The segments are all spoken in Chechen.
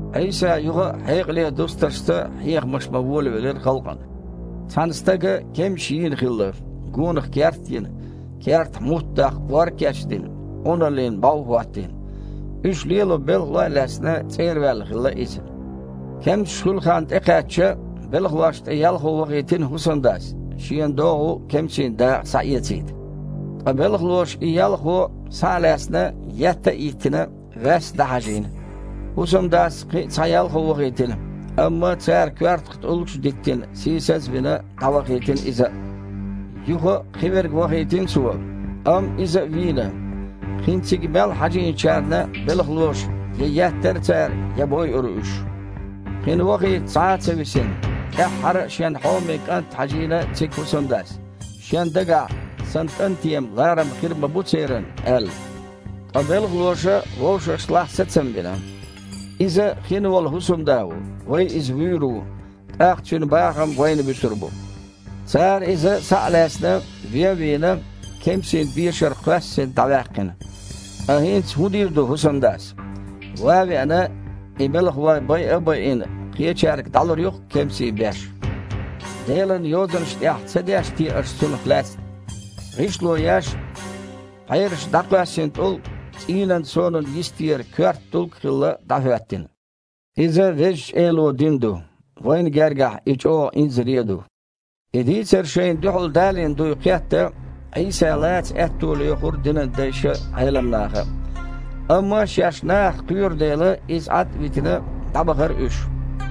Іийса юха а хьекъале дустаршца хьехамаш бан волавелира халкъана: «Цхьана стага кемсаш йийна хилла, гонах керт а йина, кертахь мутт даккха ор а кечдина, Іуналлина бІов а хІоттийна. Уьш лело белхалой а лаьцна, цІера ваьлла хилла иза. Кемсаш хуьлу хан тІекхаьчча, белхалошна тІе ялхо вахийтина хІусамдас, шена догІу кемсийн дакъа схьаэцийта. Ткъа белхалоша и ялхо, схьа а лаьцна, етта а йиттина, ваьсса дІахьажийна. ХІусамдас кхин а цхьа ялхо вахийтина, амма цара коьртах тІулгаш а диттина, сийсаз а вина, дІавахийтина иза а. Юха а кхиверг вахийтина цо, амма иза вийна, кхин цига мел хьажийначарна белхалоша я еттара цара, я бойура уьш. Кхин вахийта цхьа а ца висина, тІаьххьара а шен хьоме кІант хьажийна цига хІусамдас, шен дагахь: „Сан кІанте-м ларам хир ма бу церан“, – аьлла. Ткъа белхалоша вовшашлахь сацам бина: „Иза хин волу хІусамда ву, вай иза вуьйр ву, тІаккха цуьнан бахам вайна буьсур бу“. Цара иза, схьа а лаьцна, вен а вийна, кемсийн бешара кхоьссина дІаваьккхина. Ткъа хІинца хІун дийр ду хІусамдас? Ван а веана, и белхалой байа а байина, кхечаьрга дІалур ю-кх кемсийн беш. Делан Йозанаш тІехь ца дешна те аш цунах лаьцна: „ГІишло еш, пхьераша дІакхоьссина тІулг цІийнан сонан йистера коьрта тІулг хилла, дІахІоьттина. Иза Везачу Эло дина ду, вайна гергахь и чІогІа инзаре а ду!“» И дийцар шайна дуьхьал далийна дуй кхетта, Іийса лаца аьтто лоьхура динан дайша а, Іелам наха а. Амма шаьш нахах кхоьру дела, Иза Іад а витина, дІабахара уьш.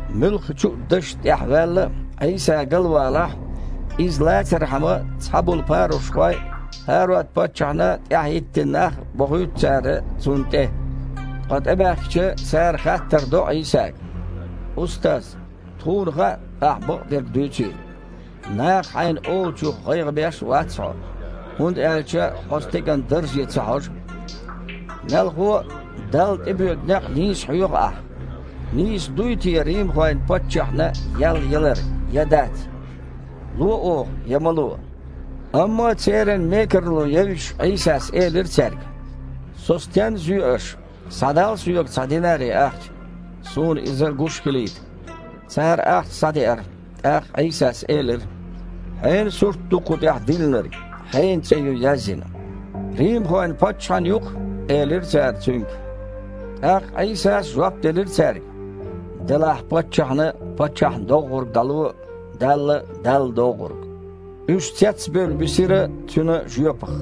Муьлххачу а дашна тІехь ваьлла а, Іийса галвалахь, Иза лацархьама цхьаболу парушхой а, ХІарод-паччахьна тІаьхьа хІиттина нах а бохуьйту цара Цунна тІе. Ткъа тІебаьхкича, цара хаттар до Іийсага: «Устаз! Тхуна хаьа Ахьа бакъдерг дуьйцийла. Наха Хьайна олучух гІайгІа беш а вац Хьо, хІунда аьлча Хьо стеган дарже ца хьожу. Мелхо а, Далла тІе боьду некъ нийса хьоьху Ахь. Нийса дуй те римхойн паччахьна ял ялар я дац? Ло оха, я ма ло?» Амма церан мекарло евзаш, Іийсас элира цаьрга: «Со стенна зоь аш? Схьадал Соьга цхьа динари ахча, Суна иза гуш хилийта». Цара ахча схьадеара. ТІаккха Іийсас элира: «Хьенан сурт ду кху тІехь диллинарг, хьенан цІе ю язйина?» «Римхойн паччахьан ю-кх», – элира цара Цуьнга. ТІаккха Іийсас жоп делира цаьрга: «Делахь паччахьна паччахьна доггІург дІало, Далла – Далла доггІург». Уьш цецбевлла бисира Цуьнан жоьпах.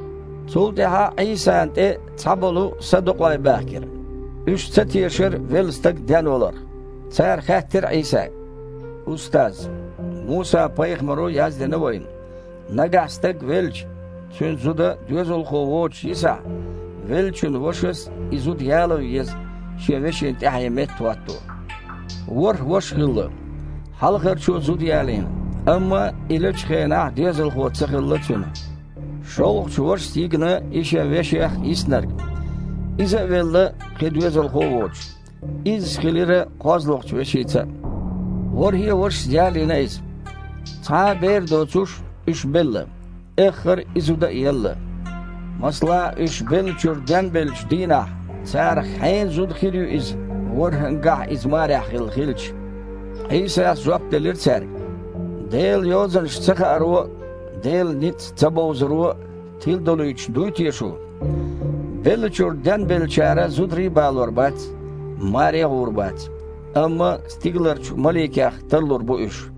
Цул тІаьхьа Іийсана тІе цхьаболу садукъой баьхкира. Уьш ца тешара велла стаг денваларх. Цара хаьттира Іийсага: «Устаз! Муса-пайхамаро яздина вайна: „Нагахь стаг велча, цуьнан зуда доьзалхо воцуш йисахь, веллачун вашас и зуда яло еза шен вешин тІаьхье меттахІотто“. ВорхІ ваша хилла. Хьалхарчо зуда ялийна, амма и лечу хенахь доьзалхо ца хилла цуьнан. ШолгІачу вашас йигна и шен веших йиснарг. Иза а велла, кхин доьзалхо а воцуш, изза хилира кхозлагІчу вешица а. ВорхІе а вашас ялийна иза, цхьа а бер доцуш, уьш белла. Эххар и зуда а елла. Масала, уьш беллачуьра денбеллачу дийнахь, царах хьенан зуда хир ю иза, ворххІангахь а иза марехь хилла хилча?» Іийсас жоп делира цаьрга: «Делан Йозанаш ца хааро а, Делан ницкъ ца бовзаро а тиладолуьйтуш дуй те шу? Беллачуьра денбеллачара зударий а балор бац, маре а гІур бац, амма стигаларчу маликех тарлур бу уьш.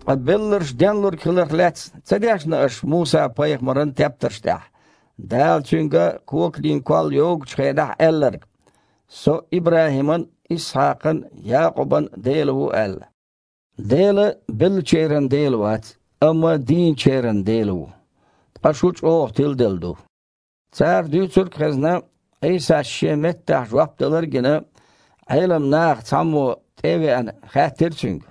Ткъа белларш денлург хиларх лаьцна ца дешна аш Муса-пайхамаран тептарш тІехь, Дала цуьнга коканийн колл йогучу хенахь аьлларг: „Со ИбрахІиман а, Исхьакхан а, Якъубан а Дела ву“, – аьлла? Дела беллачеран Дела вац, амма дийначеран Дела ву! Ткъа шу чІогІа тиладелла ду». Цара дуьйцург а хезна, Іийсас шен меттахь жоп далар а гина, Іелам нахах цхьаммо, тІе а веана, хаьттира Цуьнга: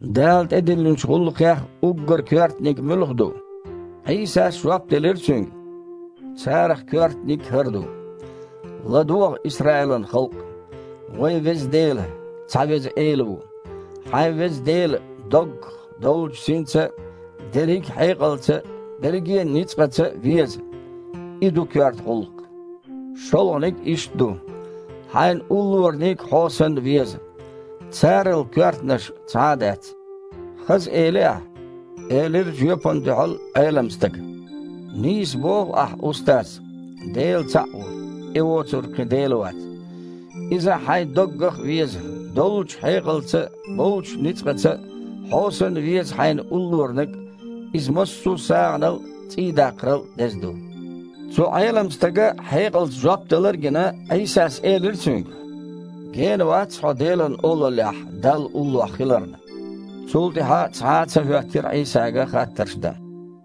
«Дала тІедиллинчу гІуллакхех уггар коьртаниг муьлха ду?» Іийсас жоп делира цуьнга: «Царах коьртаниг хІара ду: „ЛадогІа, Исраилан халкъ! Вайн Веза Дела – цхьа Веза Эла ву! Хьайн Веза Дела доггах, доллучу синца а, дерриг а хьекъалца а, берриге а ницкъаца а веза“, И ду коьрта гІуллакх! ШолгІаниг а иштта ду: „Хьайн уллораниг хьо санна веза“. Царал коьртанаш цхьа а дац». «Хаза эли Ахь», – элира жоьпана дуьхьал Іелам стага. «Нийса боху Ахь, Устаз! Дела цхьаъ ву, И воцург кхин Дела вац. Иза хьайн доггах а веза, доллучу хьекъалца а, боллучу ницкъаца а, хьо санна веза хьайна уллораниг а – иза массо сагІанал а, цІий даккхарал а деза ду». Цу Іелам стага хьекъалца жоп далар а гина, Іийсас элира цуьнга: «Гена вац хьо Делан Олаллехь Далла уллохь хиларна». Цул тІаьхьа цхьа а ца хІоьттира Іийсага хаттарш дан.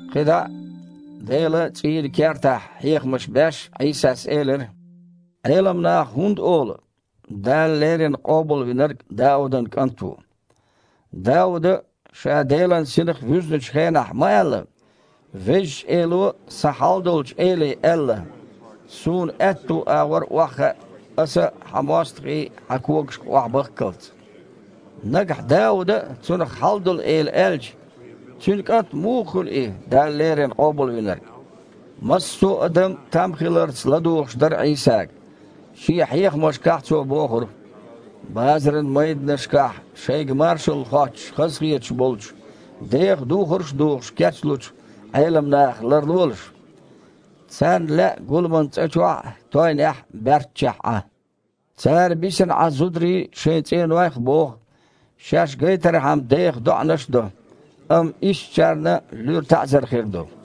Кхин дІа а Делан цІийнан кертахь хьехамаш беш Іийсас элира: «Іелам наха хІунда олу: „ Дала леррина Къобалвинарг Даудан кІант ву“? Дауда а, ша Делан Синах вуьзначу хенахь, ма аьлла: „Везачу Эло сан Хьалдолчу Эле аьлла: Суна аьтту агІор охьахаа, Аса Хьан мостагІий Хьан когашка охьабахккалц“. Нагахь Дауда а Цунах „Хьалдолу Эла“ аьлча, цуьнан кІант муха хуьлу И Дала леррина Къобалвинарг?» Массо а адам там хиларца ладугІуш дара Іийсага. Шен хьехамашкахь Цо бохура: «Базаран майданашкахь шайга маршалла хоттуш хазахеташ болчу, деха духарш а духуш кечлучу Іелам нахах ларлолаш. Царна лаьа гуламан цІа чохь а, тойнехь а баьрччехь Іан. Цара бисина Іан зударий шайн цІенойх а боху, шаьш гайтархьама деха доІанаш а до. Амма ишттачарна луьра таІзар хир ду».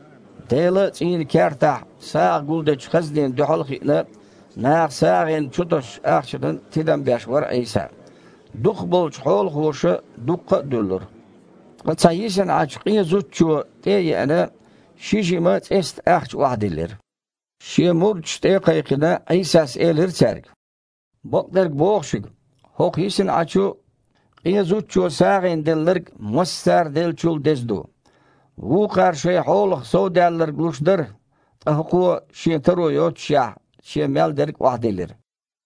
Делан цІийнан кертахь сагІа гулдечу хазнина дуьхьал а хиъна, наха сагІина чутосучу ахчанан тидам беш вара Іийса. Дукхахболчу хьолахоша дуккха а дуьллура. Ткъа цхьа йисина Іачу къен зудчо, тІе а еана, ши жима цІестан ахча охьадиллира. Шен мурдаш тІе а кхайкхина, Іийсас элира цаьрга: «Бакъдерг боху шуьга, хІокху йисна Іачу къен зудчо сагІина делларг массара деллачул а деза ду. Вукхара шайн хьолах совдаьлларг луш дара, ткъа хІокхо, шен таро йоццушехь, шен мел дерг а охьадиллира».